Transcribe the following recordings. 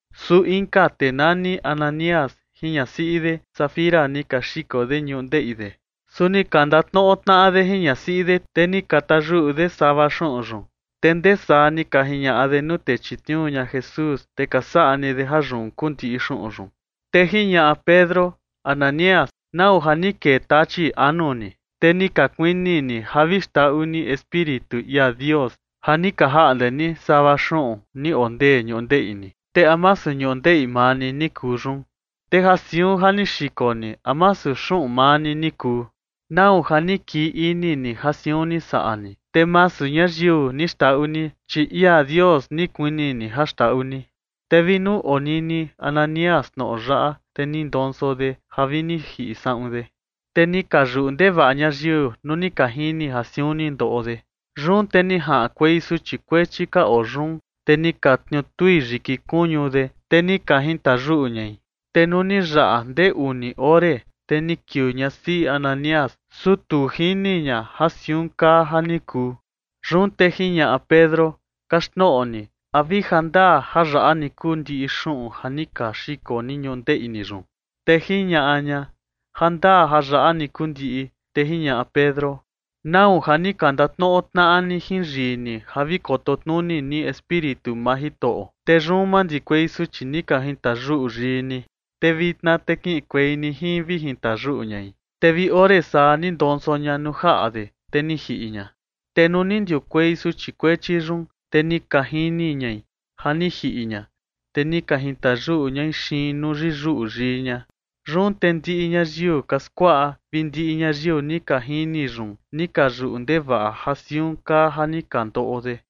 Su inka tee nani Ananías jin ñasiꞌi de Safira ni ka xiko de ñundeꞌi de. Su ni ka ndatnoꞌo tnaꞌa de jin ñasiꞌi de, te ni ka tayuꞌu de sava xuꞌun yun, te ndee saa ni ka jiñaꞌa de nuu tee ni chitniuu ña Jesús, te ka saꞌa ni de ja yun kuu ndiꞌi xuꞌun yun. Te jiñaꞌa Pedro: ―Ananías, ¿nau ja ni kee tachi anu ni, te ni ka kuini ni ja vi xndaꞌu ni Espíritu ia Dios ja ni ka jaꞌnde ni sava xuꞌun ni oo ndee ñundeꞌi ni? Te ¿a masu ñundeꞌi maa ni ni kuu yun? Te ja siun ja ni xiko ni, ¿a masu xuꞌun maa ni ni kuu? ¿Nau ja ni kii ini ni ja siun ni saꞌa ni? Te masu ñayiu ni xndaꞌu ni, chi ia Dios ni kuini ni ja xndaꞌu ni. Te vi nuu ni onini Ananías tnoꞌo yaꞌa, te ni ndonso de ja vi ni jiꞌi saꞌun de. Te ni ka yuꞌu ndevaꞌa ñayiu nuu ni ka jini ja siun ni ndoꞌo de. Yun te ni jaꞌankuei suchi kuechi ka oo yun, te ni ka tniutui yiki kuñu de, te ni ka jintayuꞌu ñai. Te nuu ni yaꞌa ndee uni ore, te ni kiuu ñasiꞌi Ananías, su tu jini ña ja siun kaa ja ni kuu. Yun te jiñaꞌa Pedro: ―Kaxtnoꞌo ni, ¿a vi jandaa ja yaꞌa ni kuu ndiꞌi xuꞌun ja ni ka xiko ni ñundeꞌi ni yun? Te jiñaꞌa ña: ―Jandaa ja yaꞌa ni kuu ndiꞌi. Te jiñaꞌa Pedro: ―¿Nau ja ni ka ndatnoꞌo tnaꞌa ni jin yii ni ja vi koto tnuni ni Espíritu maa Jitoꞌo? Te yun mandikuei suchi ni ka jintayuꞌu yii ni. Te vitna te kiꞌinkuei ni jin vi jintayuꞌu ñai. Te vi ore saa ni ndonso ña nuu jaꞌa de, te ni jiꞌi ña. Te nuu ni ndiukuei suchi kuechi yun, te ni ka jini ñai ja ni jiꞌi ña, te ni ka jintayuꞌu ñai xiin nuu yiyuꞌu yii ña. Yun te ndiꞌi ñayiu ka skuaꞌa vi ndiꞌi ñayiu ni ka jini yun, ni ka yuꞌu ndevaꞌa ja siun kaa ja ni ka ndoꞌo de.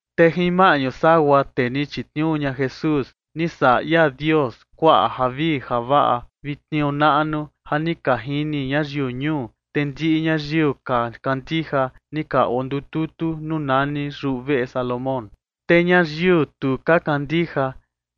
Te jin maꞌñu sagua tee ni chitniuu ña Jesús, ni saꞌa ia Dios kuaꞌa javii javaꞌa vi tniuu naꞌnu ja ni ka jini ñayiu ñuu. Te ndiꞌi ñayiu ka kandija, ni ka ondututu nuu nani Yuveꞌe Salomón. Te ñayiu tu ka kandija,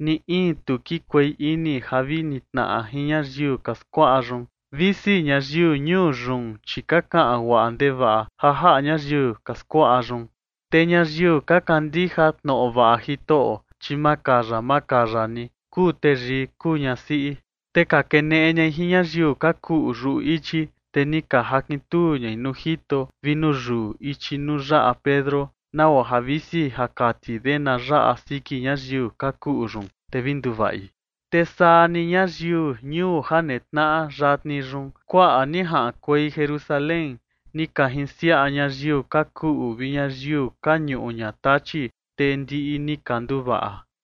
ni in tu kikuei ini ja vi nitnaꞌa jin ñayiu ka skuaꞌa yun, visi ñayiu ñuu yun, chi ka kaꞌan guaꞌa ndevaꞌa ja jaꞌa ñayiu ka skuaꞌa yun. Te ñayiu ka kandija tnoꞌo vaꞌa Jitoꞌo, chi makaya makaya ni, kuu teyii kuu ñasiꞌi. Te ka keneꞌe ñai jin ñayiu ka kuꞌu yuꞌu ichi, te ni ka jakintuu ñai nuu jito vi nuu yuu ichi nuu yaꞌa Pedro, nagua ja visi ja kati de na yaꞌa siki ñayiu ka kuꞌu yun, te vi nduvaꞌi. Te saa ni ñayiu ñuu ja netnaꞌa yatni yun, kuaꞌa ni jaꞌankuei Jerusalén ni ka jinsiaꞌa ñayiu ka kuꞌu vi ñayiu ka ñuꞌu ña tachi, te ndiꞌi ni ka nduvaꞌa.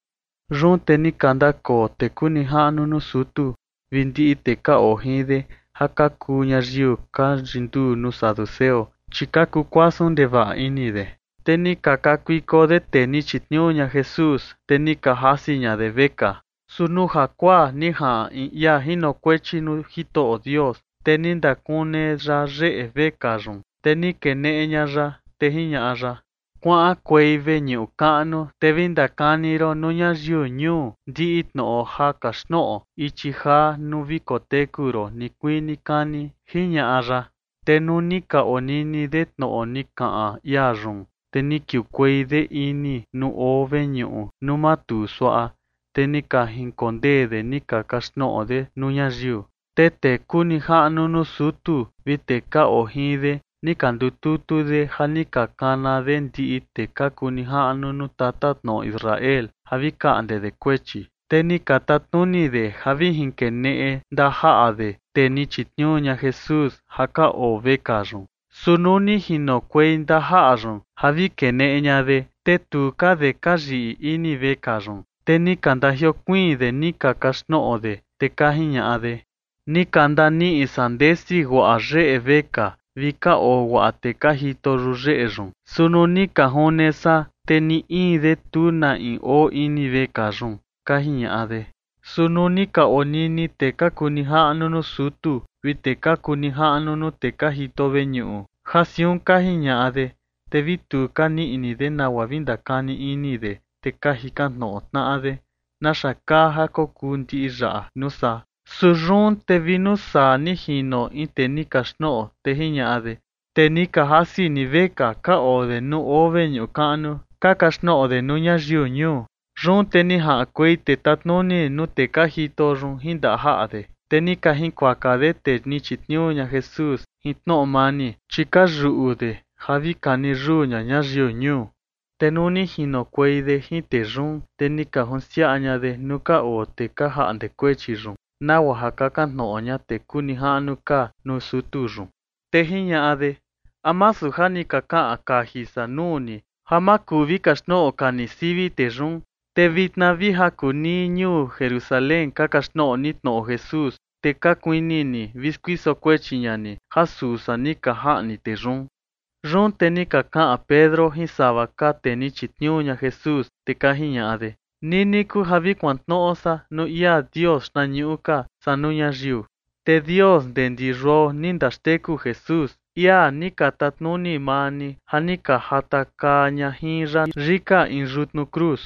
Yun te ni ka ndakoo tee kuu nijaꞌnu nuu sutu vi ndiꞌi tee ka oo jin de ja ka kuu ñayiu ka yinduu nuu saduceo, chi ka kukuasun ndevaꞌa ini de. Te ni ka kakuiko de tee ni chitniuu ña Jesús, te ni ka jasi ña de vekaa. Su nuu jakuaa ni jaꞌan in ia jinokuechi nuu Jitoꞌo Dios, te ni ndakune ya yeꞌe vekaa yun, te ni keneꞌe ña ya, te jiñaꞌa ya: ―Kuaꞌankuei veñuꞌu kaꞌnu, te vi ndakani ron nuu ñayiu ñuu ndiꞌi tnoꞌo ja kaxtnoꞌo ichi jaa nuu vi koteku ron nikuii nikani ―jiñaꞌa ya. Te nuu ni ka onini de tnoꞌo ni kaꞌan ia yun, te ni kiukuei de ini nuu oo veñuꞌu nuu matuu suaꞌa, te ni ka jinkondee de ni ka kaxtnoꞌo de nuu ñayiu. Te tee kuu nijaꞌnu nuu sutu vi tee ka oo jin de ni ka ndututu de ja ni ka kana de ndiꞌi tee ka kuu nijaꞌnu nuu tatatnoꞌo Israel ja vi kaꞌnde de kuechi. Te ni ka tatnuni de ja vi jinkeneꞌe ndajaꞌa de tee ni chitniuu ña Jesús ja ka oo vekaa yun. Su nuu ni jinokuei ndajaꞌa yun ja vi keneꞌe ña de, te tu ka de ka yiꞌi ini vekaa yun, te ni ka ndajiokuiin de ni ka kaxtnoꞌo de, te ka jiñaꞌa de: ―Ni ka ndaniꞌi san ndesi guaꞌa yeꞌe vekaa vi ka oo guaꞌa tee ka jito yuyeꞌe yun, su nuu ni ka june san, te ni in de, tu na in oo ini vekaa yun ―ka jiñaꞌa de. Su nuu ni ka onini tee ka kuu nijaꞌnu nuu sutu vi tee ka kuu nijaꞌnu nuu tee ka jito veñuꞌu ja siun ka jiñaꞌa de, te vi tu ka nii ini de nagua vi ndakani ini de, te ka jikan tnoꞌo tnaꞌa de: ―¿Naxa kaa ja kokuu ndiꞌi yaꞌa nuu saa? Su yun te vi nuu saa ni jino in tee ni kaxtnoꞌo, te jiñaꞌa de: ―Tee ni ka jasi ni vekaa ka oo de nuu oo veñuꞌu kaꞌnu ka kaxtnoꞌo de nuu ñayiu ñuu. Yun te ni jaꞌankuei tee tatnuni nuu tee ka jito yun jin ndajaꞌa de, te ni ka jinkuaka de tee ni chitniuu ña Jesús jin tnoꞌo mani, chi ka yuꞌu de ja vi kani yuu ña ñayiu ñuu. Te nuu ni jinokuei de jin tee yun, te ni ka junsiaꞌa ña de nuu ka oo tee ka jaꞌnde kuechi yun, nagua ja kakan tnoꞌo ña tee kuu nijaꞌnu ka nuu sutu yun. Te jiñaꞌa de: ―¿A masu ja ni ka kaꞌan kaji san nuu ni, ja ma kuu vi kaxtnoꞌo ka ni sivi tee yun? Te vitna vi ja kuu nii ñuu Jerusalén ka kaxtnoꞌo ni tnoꞌo Jesús, te ka kuini ni vi skuiso kuechi ña ni ja suu san ni ka jaꞌni tee yun. Yun te ni ka kaꞌan Pedro jin sava ka tee ni chitniuu ña Jesús, te ka jiñaꞌa de: ―Nini kuu ja vi kuantnoꞌo san nuu ia Dios xtnañuꞌu ka, saa nuu ñayiu. Te Dios ndee ndi yuao ni ndaxteku Jesús, ia ni ka tatnuni maa ni ja ni ka jatakaa ña jin ya yika in yutnu cruz.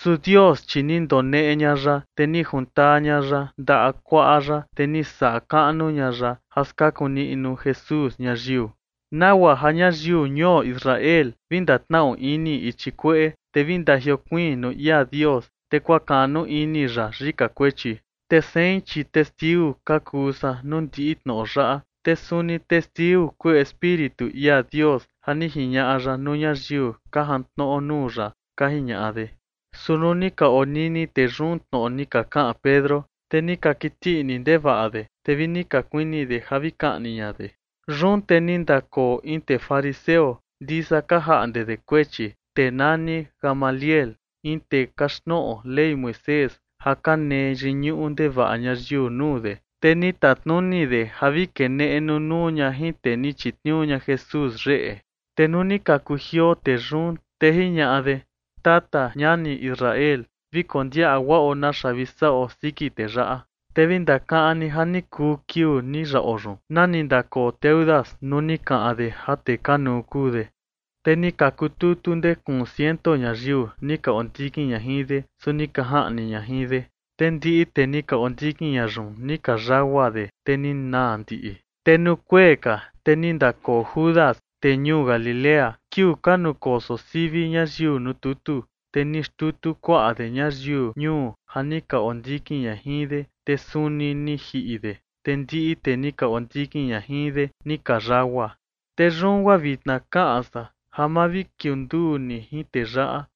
Su Dios, chi ni ndoneꞌe ña ya, te ni juntaa ña ya ndaꞌa kuaꞌa ya, te ni saꞌa kaꞌnu ña ya ja skaku niꞌnu Jesús ñayiu, nagua ja ñayiu ñuo Israel vi ndatnaꞌu ini ichi kueꞌe, te vi ndajiokuiin nuu ia Dios, te kuakaꞌnu ini ya yika kuechi. Te sein, chi testiu ka kuu san nuu ndiꞌi tnoꞌo yaꞌa. Te suni testiu kuu Espíritu ia Dios ja ni jiñaꞌa ya nuu ñayiu ka jantnoꞌo nuu ya ―ka jiñaꞌa de. Su nuu ni ka onini tee yun tnoꞌo ni ka kaꞌan Pedro, te ni ka kiti ini ndevaꞌa de, te vi ni ka kuini de ja vi kaꞌni ña de. Yun te ni ndakoo in tee fariseo ndisa ka jaꞌnde de kuechi, tee nani Gamaliel, in tee kaxtnoꞌo Ley Moisés ja ka nee yiñuꞌu ndevaꞌa ñayiu nuu de, te ni tatnuni de ja vi keneꞌe nunuu ña jin tee ni chitniuu ña Jesús yeꞌe. Te nuu ni ka kujioo tee yun, te jiñaꞌa de: ―Tata ñani Israel, vi kondiaꞌa guaꞌo naxa vi saꞌo siki tee yaꞌa. Te vi ndakaꞌan ni ja ni kuu kiuu ni yaꞌo yun, nani ndakoo Teudas nuu ni kaꞌan de ja tee kanuu kuu de, te ni ka kututu ndee kuun ciento ñayiu ni ka ondikin ña jin de. Su ni ka jaꞌni ña jin de, te ndiꞌi tee ni ka ondikin ña yun ni ka yagua de, te ni naa ndiꞌi. Te nuu kuee ka, te ni ndakoo Judas, tee ñuu Galilea, kiuu ka nukoso sivi ñayiu nuu tutu, te ni xtutu kuaꞌa de ñayiu ñuu ja ni ka ondikin ña jin de. Te suni ni jiꞌi de, te ndiꞌi tee ni ka ondikin ña jin de ni ka yagua. Te yun guaa vitna kaꞌan san ja ma vi kiunduu ni jin tee yaꞌa,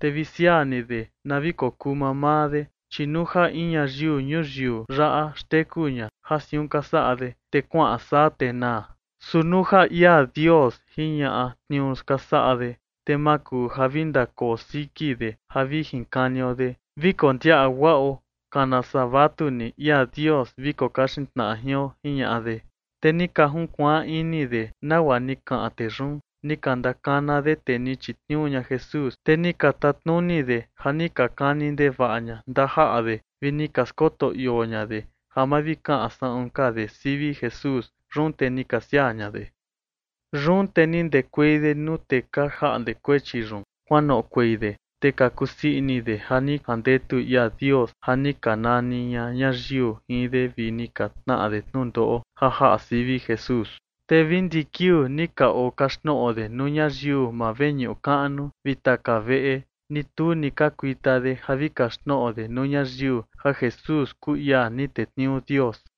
te vi siaa ni de na vi kokuu mamaa de, chi nuu ja in ñayiu ñuyiu yaꞌa xteku ña ja siun ka saꞌa de, te kuaꞌan saa te naa. Su nuu ja ia Dios jiñaꞌa tniuu ka saꞌa de, te ma kuu ja vi ndakoo siki de ja vi jinkanio de. Vi kondiaꞌa guaꞌo, kana saa vatu ni ia Dios vi kokaxin tnaꞌa jion ―jiñaꞌa de. Te ni ka junkuaan ini de nagua ni kaꞌan tee yun. Ni ka ndakana de tee ni chitniuu ña Jesús, te ni ka tatnuni de ja ni ka kani ndevaꞌa ña ndajaꞌa de, vi ni ka skoto ioo ña de ja ma vi kaꞌan saꞌun ka de sivi Jesús. Yun te ni ka siaa ña de. Yun te ni ndekuei de nuu tee ka jaꞌnde kuechi yun. Kuanoꞌokuei de, te ka kusii ini de ja ni jandetu ia Dios ja ni ka nani ña ñayiu jin de vi ni ka tnaꞌa de tnundoꞌo ja jaꞌa sivi Jesús. Te vi ndiꞌi kiuu ni ka okaxtnoꞌo de nuu ñayiu maa veñuꞌu kaꞌnu vi taka veꞌe, ni tu ni ka kuita de ja vi kaxtnoꞌo de nuu ñayiu ja Jesús kuu ia ni tetniuu Dios.